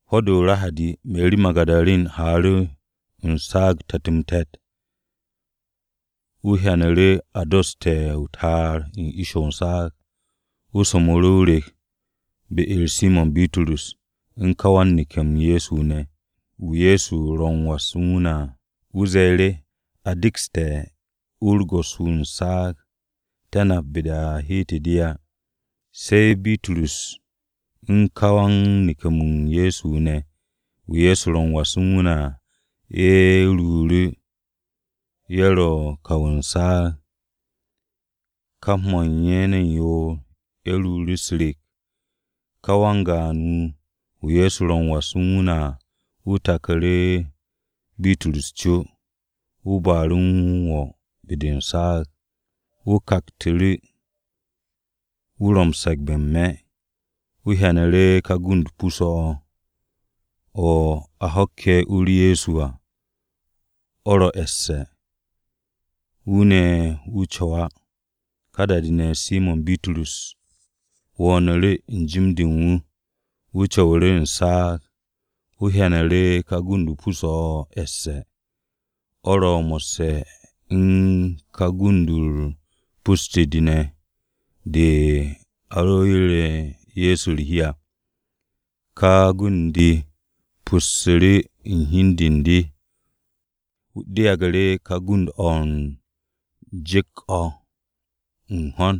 Ho̱-de o-Rahadi, Meri Magu̱darin haaru̱ u̱n saag te̱t-m-te̱t. Wu̱ hyanu̱ru̱ a dosste̱ o-ta'ar u̱n ish u̱n saag. Wu̱ so̱mnu̱ru̱ o-rek be-u̱r Simo̱n Bitrus u̱n ka wan-neke̱-m Ye̱so wu̱ ne̱, wu̱ Ye̱so ro m-was u̱n wu̱ ne̱ à. Wu̱ ze̱e̱ru̱, “A dekste̱ u-u̱r Go̱s-wu̱ u̱n saag. Te̱ napu̱ ne̱ be-de a heete̱ de á.” Se̱ Bitrus u̱n ka wan-neke̱-m Ye̱so wu̱ ne̱, wu̱ Ye̱so ro m-was u̱n wu̱ ne̱ à, ye̱ ruuru̱, ye̱ ro̱ u̱n kaw u̱n saag. Kap mo̱ u̱n ye̱ yoor-ye̱ ruuru̱ u̱s-rek. Ka wan-gaan-wu̱, wu̱ Ye̱so ro m-was u̱n wu̱ ne̱ à, wu̱ taku̱ru̱ Bitrus co. Wu̱ ba'u̱ru̱ wu̱ m-wo̱ be-de u̱n saag. Wu̱ kaktu̱ru̱, wu̱ ro̱ m-se̱gbe̱ n-me̱. Wu̱ hyanu̱ru̱ ka gund-o pus-o̱ o̱, o̱ a ho̱kke̱ u-u̱r Ye̱so à, o̱ ro̱ e̱sse̱. Wu̱ ne̱ wu̱ co̱w á. Ka da-de ne̱, Simo̱n Bitrus wo̱o̱nu̱ru̱ u̱n n-jim de u̱n wu̱, wu̱ co̱wu̱ru̱ u̱n saag. Wu̱ hyanu̱ru̱ ka gund-o pus-o̱ o̱ e̱sse̱. O̱ ro̱ mo̱sse̱ u̱n ka gund-u̱r pus-de de ne̱ de a ro yeru̱te̱ Ye̱so u̱r-hi à. Ka gund-de pussu̱ru̱ u̱n hi u̱n de u̱n de, de yage̱ ká gund-o̱ u̱n ju̱k-o̱ u̱n ho̱n.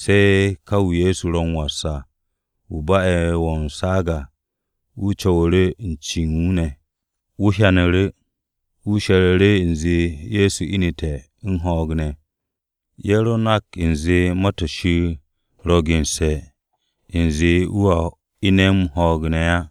Se̱ ka wu̱ Ye̱so ro u̱n was à, wu̱ ba'e̱ m-wo̱ u̱n saag à, wu̱ co̱wu̱ru̱ u̱n ce u̱n wu̱ ne̱. Wu̱ hyanu̱ru̱, wu̱ she̱ru̱ru̱ u̱nze Ye̱so inu̱te̱ u̱n ho̱o̱g ne̱. Ye̱ ro nak u̱nze Ma-to̱ Shir ro̱ gense̱ u̱nze wu̱a ine̱ u̱n ho̱o̱g ne̱ á.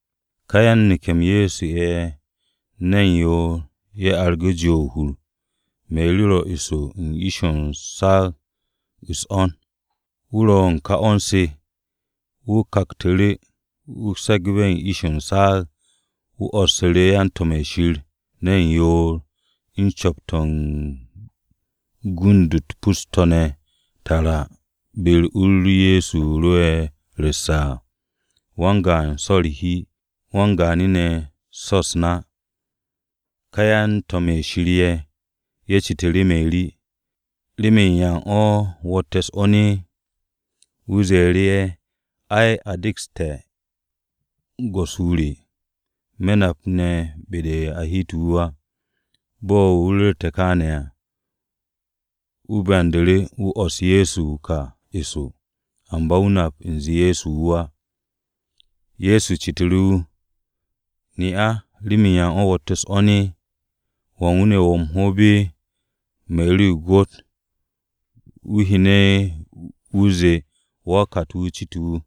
Ká yan-neke̱-m Ye̱so ye̱ ne̱n yoor-ye̱ argu̱ jo o-hur. Meri ro eso u̱n ish u̱n saag u̱s-'wo̱n. Wu̱ ro̱ u̱n ka 'wo̱n-se, wu̱ kaktu̱ru̱, wu̱ se̱gbu̱ru̱ ish u̱n saag. Wu̱ 'wo̱ssu̱ru̱ yan-to̱m-ye̱ Shir ne̱n yoor u̱n cu̱p-to̱ u̱n gund-u̱t pus-to̱ ne̱ tara be-de u-u̱r Ye̱so ro'e̱ ru̱sse̱ à, wan-gaan so̱ u̱r-hi, wan-gaanu̱ ne̱ so̱ u̱s-na. Ka yan-to̱m-ye̱ Shir ye̱, ye̱ citu̱ru̱ Meri, “¿Remen yan o̱ wo̱tte̱ u̱s-'wo̱n?” Wu̱ ze̱e̱ru̱ ye̱, “Ai, a dekste̱ Go̱s-wu̱ re, me̱ napu̱ ne̱ be-de a heete̱ wu̱ á.” Bo̱ wu̱ ru̱rte̱ kááne̱ à, wu̱ byandu̱ru̱, wu̱ 'wo̱s Ye̱so wu̱ ka eso. Amba wu̱ nap u̱nze Ye̱so wu̱ á. Ye̱so citu̱ru̱ wu̱, “¿Ne'a, remen yan o̱ wo̱tte̱ u̱s-'wo̱n? ¿Wan wu̱ ne̱ wo̱ o-hoob?” Meri ro̱ o-gwo̱t wu̱ hyene̱ wu̱ zee wa-o-kat-wu̱ cite̱ wu̱,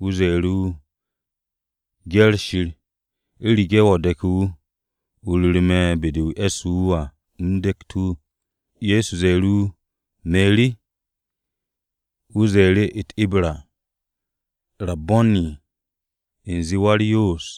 wu̱ ze̱e̱ru̱ wu̱. “Gye̱r Shir, u̱rege̱ wo̱ de̱ke̱ wu̱, o ru̱ru̱ me̱ be-de o e̱sse̱ wu̱ à, u̱m dekt wu̱.” Ye̱so ze̱e̱ru̱ wu̱, “Meri.” Wu̱ ze̱e̱ru̱ u̱t-Ibra, “Rabbo̱ni!” (U̱nze Wa-u̱r-Yoos).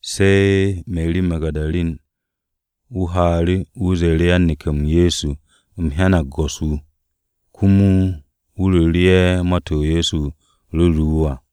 Se̱ Meri Magu̱darin wu̱ haaru̱, wu̱ ze̱e̱ru̱ yan-neke̱-m Ye̱so, “U̱m hyanag Go̱s-wu̱!” Komo wu̱ ru̱ru̱ ye̱ ma-to̱ Ye̱so ru̱ru̱ wu̱ à.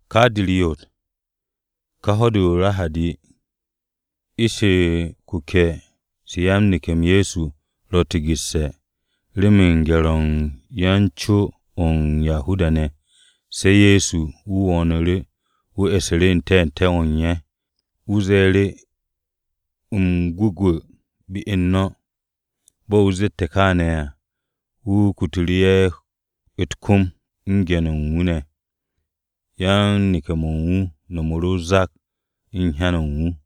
Ka de u̱r-ryot, ká ho̱-de o-Rahadi de, ish-se u̱t-kuke̱ se u̱n yan-neke̱-m Ye̱so, ro tigu̱sse̱, remen u̱n gye̱r-o̱ u̱n yan-co o̱ u̱n Yahuda-ne̱. Se̱ Ye̱so wu̱ wo̱o̱nu̱ru̱, wu̱ e̱su̱ru̱ n-te̱te̱ o̱ u̱n ye̱, wu̱ ze̱e̱ru̱, “M-gwu̱gwu̱ be u̱n no̱!” Bo̱ wu̱ zette̱ kááne̱ à, wu̱ kutu̱ru̱ ye̱ u̱t-kom u̱n ge̱n-yo u̱n wu̱ ne̱. Yan-neke̱-mo̱ u̱n wu̱ no̱mu̱ru̱ zak-o̱ u̱n hyan-mo̱ u̱n wu̱.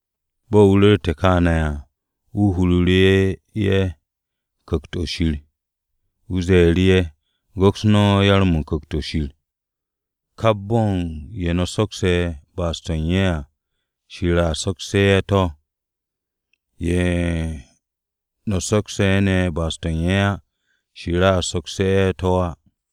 Bo̱ wu̱ ru̱rte̱ kááne̱ à, wu̱ huru̱ru̱ ye̱ Ku̱kt-o̱ Shir. Wu̱ ze̱e̱ru̱ ye̱, “Go̱ks no̱ Yo-mo̱ u̱n Ku̱kt-o̱ Shir. Kap bo̱ u̱n ye̱ no̱ sokse̱ ba'as-to̱ u̱n ye̱ à, Shir soksu̱te̱ ye̱ to̱. Ye̱ no̱ sokse̱ ne̱ ba'as-to̱ u̱n ye̱ á, Shir sokse̱ ye̱ to̱ á.”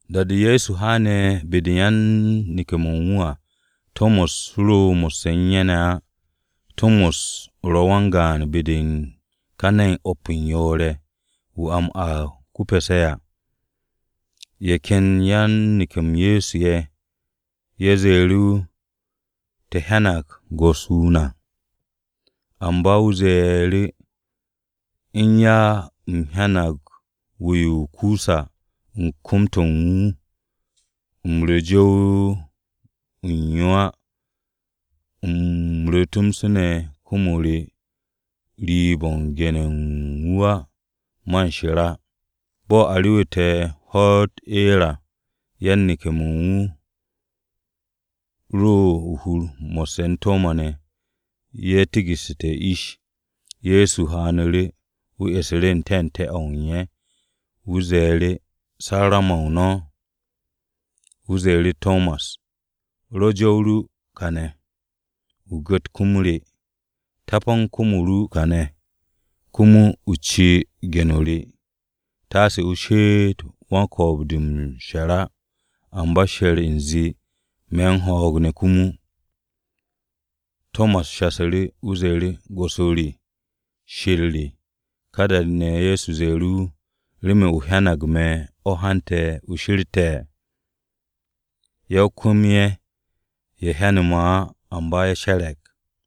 Da-de Ye̱so haane̱ be-de yan-neke̱-mo̱ u̱n wu̱ à, Tomas ro mo̱sse̱ u̱n ye̱ ne̱ á. Tomas ro̱ wan-gaan be-de u̱n ka ne̱n o̱p u̱n yoor-ye̱, (wu̱ a m-aag ko-Pe̱se̱ à). Ye̱ ken yan-neke̱-m Ye̱so ye̱, ye̱ ze̱e̱ru̱ wu̱. “Te̱ hyanag Go̱s-wu̱ na!” Amba wu̱ ze̱e̱ru̱, “U̱n ya u̱m hyanag wu-yo o-kusa u̱n kom-to̱ u̱n wu̱, u̱m ru̱ o-jow u̱n yo á, u̱m ru̱ tomso ne̱ kom-o re u̱n riib-o̱ u̱n ge̱n-ye̱ u̱n wu̱ á, man she̱r á.” Bo̱ a rewu̱te̱ ho̱-u̱t eer à, yan-neke̱-mo̱ u̱n wu̱ ro o-hur mo̱sse̱ u̱n Tomas ne̱. Ye̱ tigu̱sse̱ u̱s-ish. Ye̱so haanu̱ru̱, wu̱ e̱su̱ru̱ n-te̱te̱ o̱ u̱n ye̱. Wu̱ ze̱e̱ru̱, “Sarru̱ma-o no̱!” Wu̱ ze̱e̱ru̱ Tomas, “Rwo̱ jow-o ru kàne̱, o gu̱t kom-o re. Tapan kom-o ru kàne̱ komo ne̱ o ci ge̱n-o re. Taase o she'et wan-ko̱o̱b-de m-she̱r á, amba she̱r u̱nze me̱ m-ho̱o̱g ne̱ komo.” Tomas shasu̱ru̱, wu̱ ze̱e̱ru̱, “Go̱s-wu̱ re! Shir re!” Ka da-de ne̱, Ye̱so ze̱e̱ru̱ wu̱, “¿Remen o hyanag me̱ o̱ hante̱ o she̱rte̱? Ya-o-kwu̱m-ye̱, ye̱ hyane̱ me̱ á, amba ye̱ she̱re̱g.”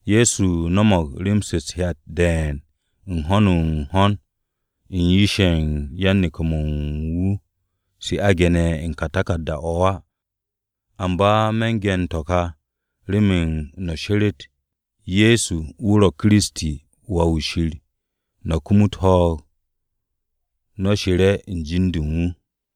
Ye̱so no̱mo̱g rem-se u̱t-hyat de̱e̱n u̱n ho̱n-n-ho̱n u̱n yish-ye̱ u̱n yan-neke̱-mo̱ u̱n wu̱ se a ge̱ne̱ u̱n ka taku̱rda-o̱ á. Amba me̱n ge̱n to̱ ka remen no̱ she̱re̱t Ye̱so wu̱ ro̱ Kiristi, Wà-wu̱ Shir, no̱ kumut ho̱o̱g no̱ she̱re̱ u̱n jin-de u̱n wu̱.